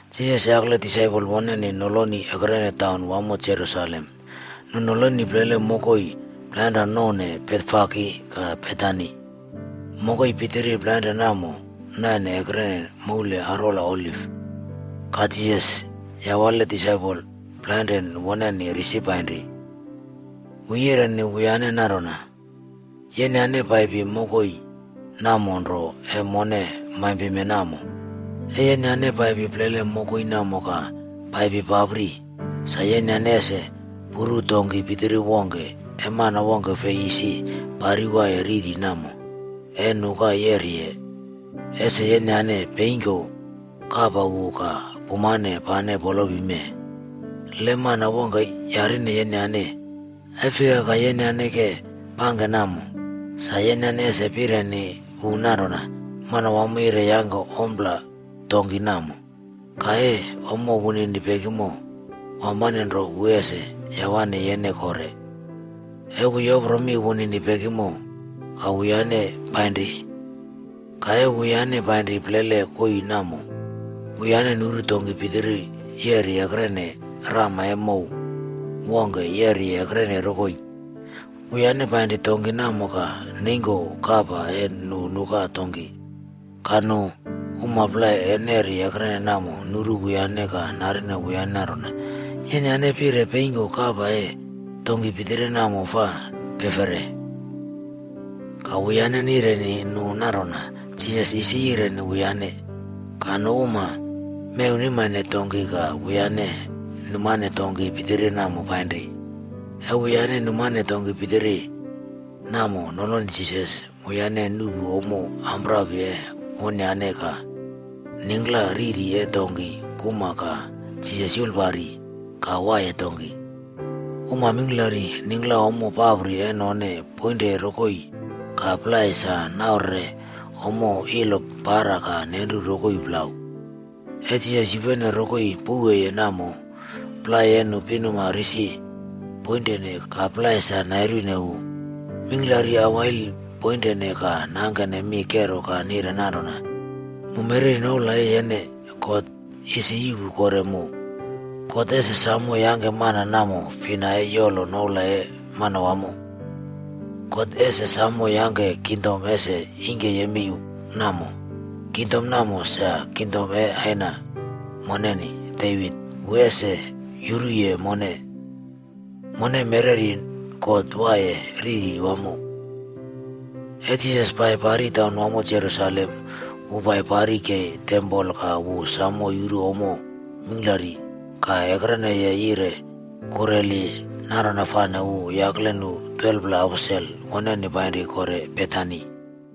Jisas yakle disaipol woneni noloni ekrenene taun wamo Jerusalem. Nu noloni plele mokoi plainrane nouw Betfage ka Betani. Mokoi pitiri plainrane namo naine ekrene moul arwola Oliv. Ka Jisas yawale disaipol plainrane woneni risi painri. Wu yireni wuyane nanrona, “Yenyane paipi mokoi namo nro e mone maimpime namo. E yenyane paipi plele mokoi namo ka paipi papri, sa yenyane ese puru donki pitiri wongke e mana wongke fi isi parwaiye riri namo, e nuka yeriye. Ese yeneyane peingko kapa wu ka pumane pane polopi mee. Le mana wongke yarine yenyane, ‘E fika ka yenyane ke pangke namo,’ sa yenyane ese pireni wu nanrona, ‘Manawamo yire yangke ompla donki namo. Ka e ommo wunini pekimo, wampane nro wu ese yawe yene kore.’” E wu yopro mi wunini pekimo ka wuyane painri. Ka e wuyane pairi plele koii namo, wuyane nuru donki pitiri yeri ekrene rama e mow wongke yeri ekrene rokoi. Wuyane painri donki namo ka neingko kapa e nu nuka donki. Ka nu uma plai e neri ekrene namo nuru wuyane ka narine wuyane nanrona, “Yenyane peri peingko kapa e donki pitiri namo fa pefere?” Ka wuyane nireni nu nanrona Jisas isi yireni wuyane. Ka nu uma mewnimane donki ka wuyane numane donki pitiri namo painri. E wuyane numane donki pitiri namo noloni Jisas, wuyane nuꞌpu ommo ampapri e wonyane ka ningkla riri e donki kuma ka Jisas yulpari ka waiye donki. Uma mingklari ningkla ommo ampapri e none poinre rokoi ka plai sa naurere ommo ilo para ka nenru rokoi plau. E Jisas yupene rokoi pouweye namo, plai e nu pinuma risi poinre ka plai sa nairu wu. Mingklari awail poinre ka nangke mi kero ka nire nanrona, “Mu mereri noula e yene, God ese yuꞌpu kore mu! God ese samo yangke mana namo fina e yolowi noula e Manawamo. God ese samo yangke kingdom ese ingke yemei namo. Kingdom namo, sa kingdom e aina moneni, Devit. Wu ese yuruye mone. Mone mereri God waiye riri wamo!” E Jisas pai pari taunwamo Jerusalem, wu pai pari kei tempol ka wu samo yuru ommo mingklari. Ka ekreneye yire kureli, nanrona fane wu yakle nu 12pla aposel woneni painri kore Betani.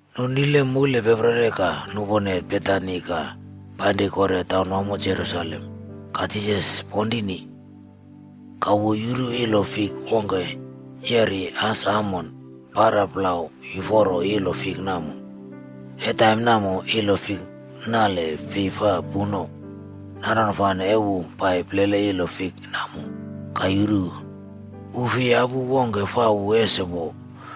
Nu nile moulpeperi ka nupone Betani ka painri kore taunwamo Jerusalem, ka Jisas ponrini. Ka wu yuru ilo fik wongke yeri as amon para plau yuforo ilo fik namo. E taim namo, ilo fik nale fi fa puno. Nanrona fane e wu pai plele ilo fik namo ka yuru, wu fei yapu wongke fa wu ese wo.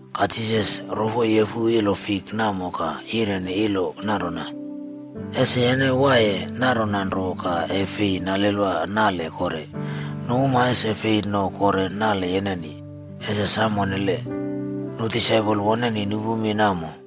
Ka Jisas rofo refu ilo fik namo ka yireni ilo nanrona, “Ese yene waiye nanrona nro ka e fi nalelwa nale kore. Nu uma ese fei no kore nale yeneni. Ese sam onnele!” Nu disaipol woneni nupu mi namo.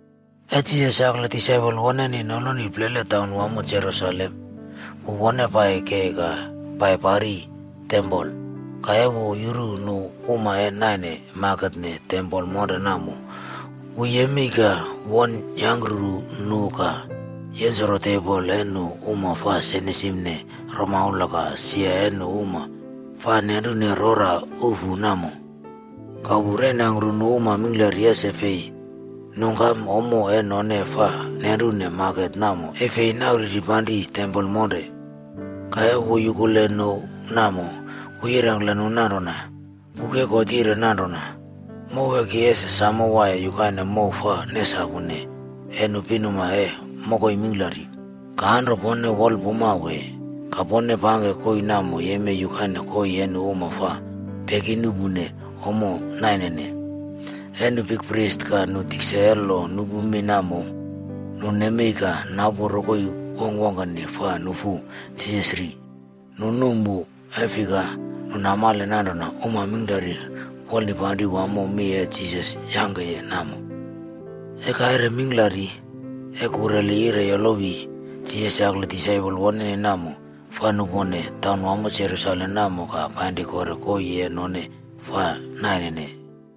E Jisas yakle disaipol woneni noloni plele taunwamo Jerusalem, wu won pai kei ka pai pari tempol. Ka e wu yuru nu uma e naine maketne tempol monre namo, wu yemei ka won yangkrupu nu ka yensoro tebol e nu uma fa senisimne romaula ka sia e nu uma fa nenrune rora ufu namo. Ka wu reinangkru nu uma mingklari ese fi nungkam ommo e none fa nenrune maket namo e fei nauri panri tempol monre. Ka e wu yukuleye nu namo, wu yirengkle nu nanrona, “Buk e God yire nanrona, ‘Mow e ki ese samo waiye yukaine mow fa nesapune e nu pinuma e mokoi mingklari.’ Ka anro pone wolpuma wee? Ka pone pangke koii namo yemei yukaine koii e nu uma fa peki nuꞌpu ommo nainene.” E nu bikpris ka nu tikse e lo nuꞌpu mi namo, nu nemei ka napu rokoi wongkwongkeni fa nufu Jisas ri. Nu num wu, e fika, nu namale nanrona uma mingklari wolnipanri wamo mi e Jisas yangke namo. E kaire mingklari, e kureli yire yolowi, Jisas yakle disaipol woneni namo, fa nupone taunwamo Jerusalem namo ka painri kore koii e none fa nainene.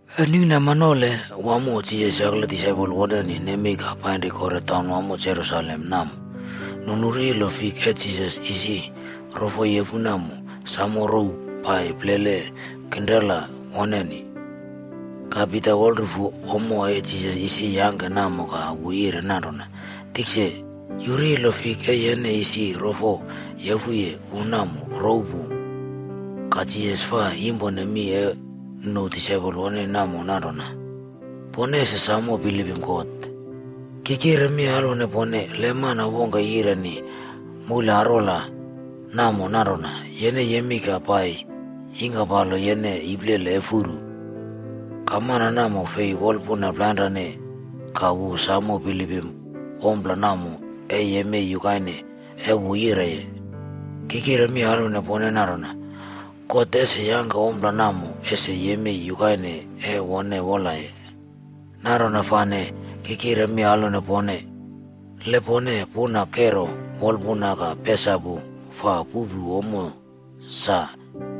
E ningkinama nole wamo Jisas yakle disaipol woneni nemei ka painri kore taunwamo Jerusalem namo, nu nuru ilo fik e Jisas isi rofo refu namo samo rouw pai plele kinrela woneni. Ka Pita wolrufu ommo e Jisas isi yangke namo ka wu yire nanrona, “Tikse, yuru ilo fik e yene isi rofo refuye wu namo rouw pu.” Ka Jisas fa yimpone mi e nu disaipol woneni namo nanrona, “Pone ese samo bilipim God. Ki kire mi alwone pone, le mana wongke yireni moule arwola namo nanrona, ‘Yene yemei ka pai yingkapalo yene iplele e furu.’ Ka mana namo fi wolpuna plainren ka wu samo bilipim ompla namo ee yemei yukaine e wu yireye. Ki kire mi alwone pone nanrona, God ese yangke ompla namo ese yemei yukaine e wone wolaye. Nanrona nro, ki kire mi alwone pone, le pone puna kero wolpuna ka pesapu fa puꞌpu ommo sa,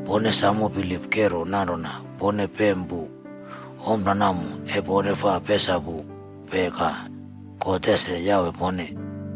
pone samo bilip kero nanrona pone pem pu ompla namo e pone fa mesapupe ka God ese yawe pone.”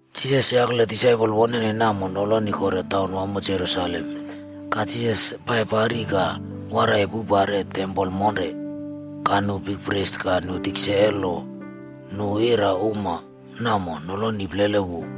Jisas yakle disaipol woneni namo noloni kore taun wamo Jerusalem. Ka Jisas pai pari ka waraiye poupare tempol monre. Ka nu bikpris ka nu tikse e lo ka nu ira uma namo noloni plele wu.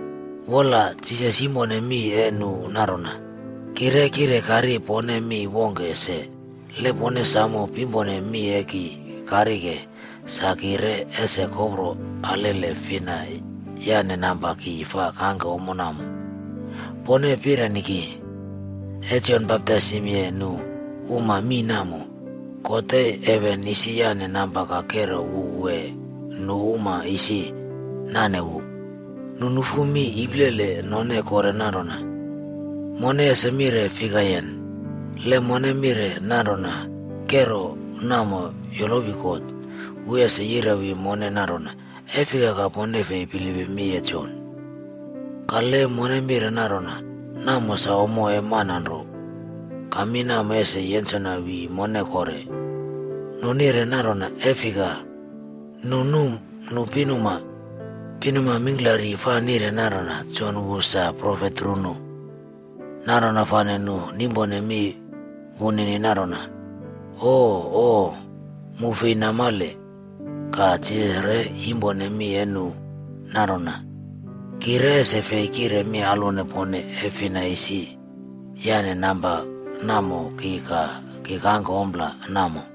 Wola, Jisas yimpone mi e nu nanrona, “Ki re kire karine pone mi wongke se. Le pone samo pimpone mi e ki karike, sa ki re ese kopro alele fina yane namba ki fa kangke ommo namo. Pone pireni ki, e Jon baptaisimye nu uma mii namo, God e heven isi yane namba ka kero wu wee nu uma isi nane wu?” Nu nufu mi iplele none kore nanrona, “Mone ese mire fikayen? Le mone mire nanrona kero namo yolowi God, wu ese yirewi mone nanrona, ‘E fika ka pone fei bilipim mi e Jon?’ Ka le mone mire nanrona ‘Namo sa ommo e mana nro,’ ka mi namo ese yensona wi mone kore.” Nu nire nanrona e fika, nu num nu pinuma. Pinuma mingklari fa nire nanrona Jon wu sa profet runu. Nanrona fane nu nimpone mi wunini nanrona, “Ooo, mu fei namale.” Ka Jisas re yimpone mi e nu nanrona, “Ki re ese fei kire mi alwone pone e fina isi yane namba namo ki ka ki kangke ompla namo.”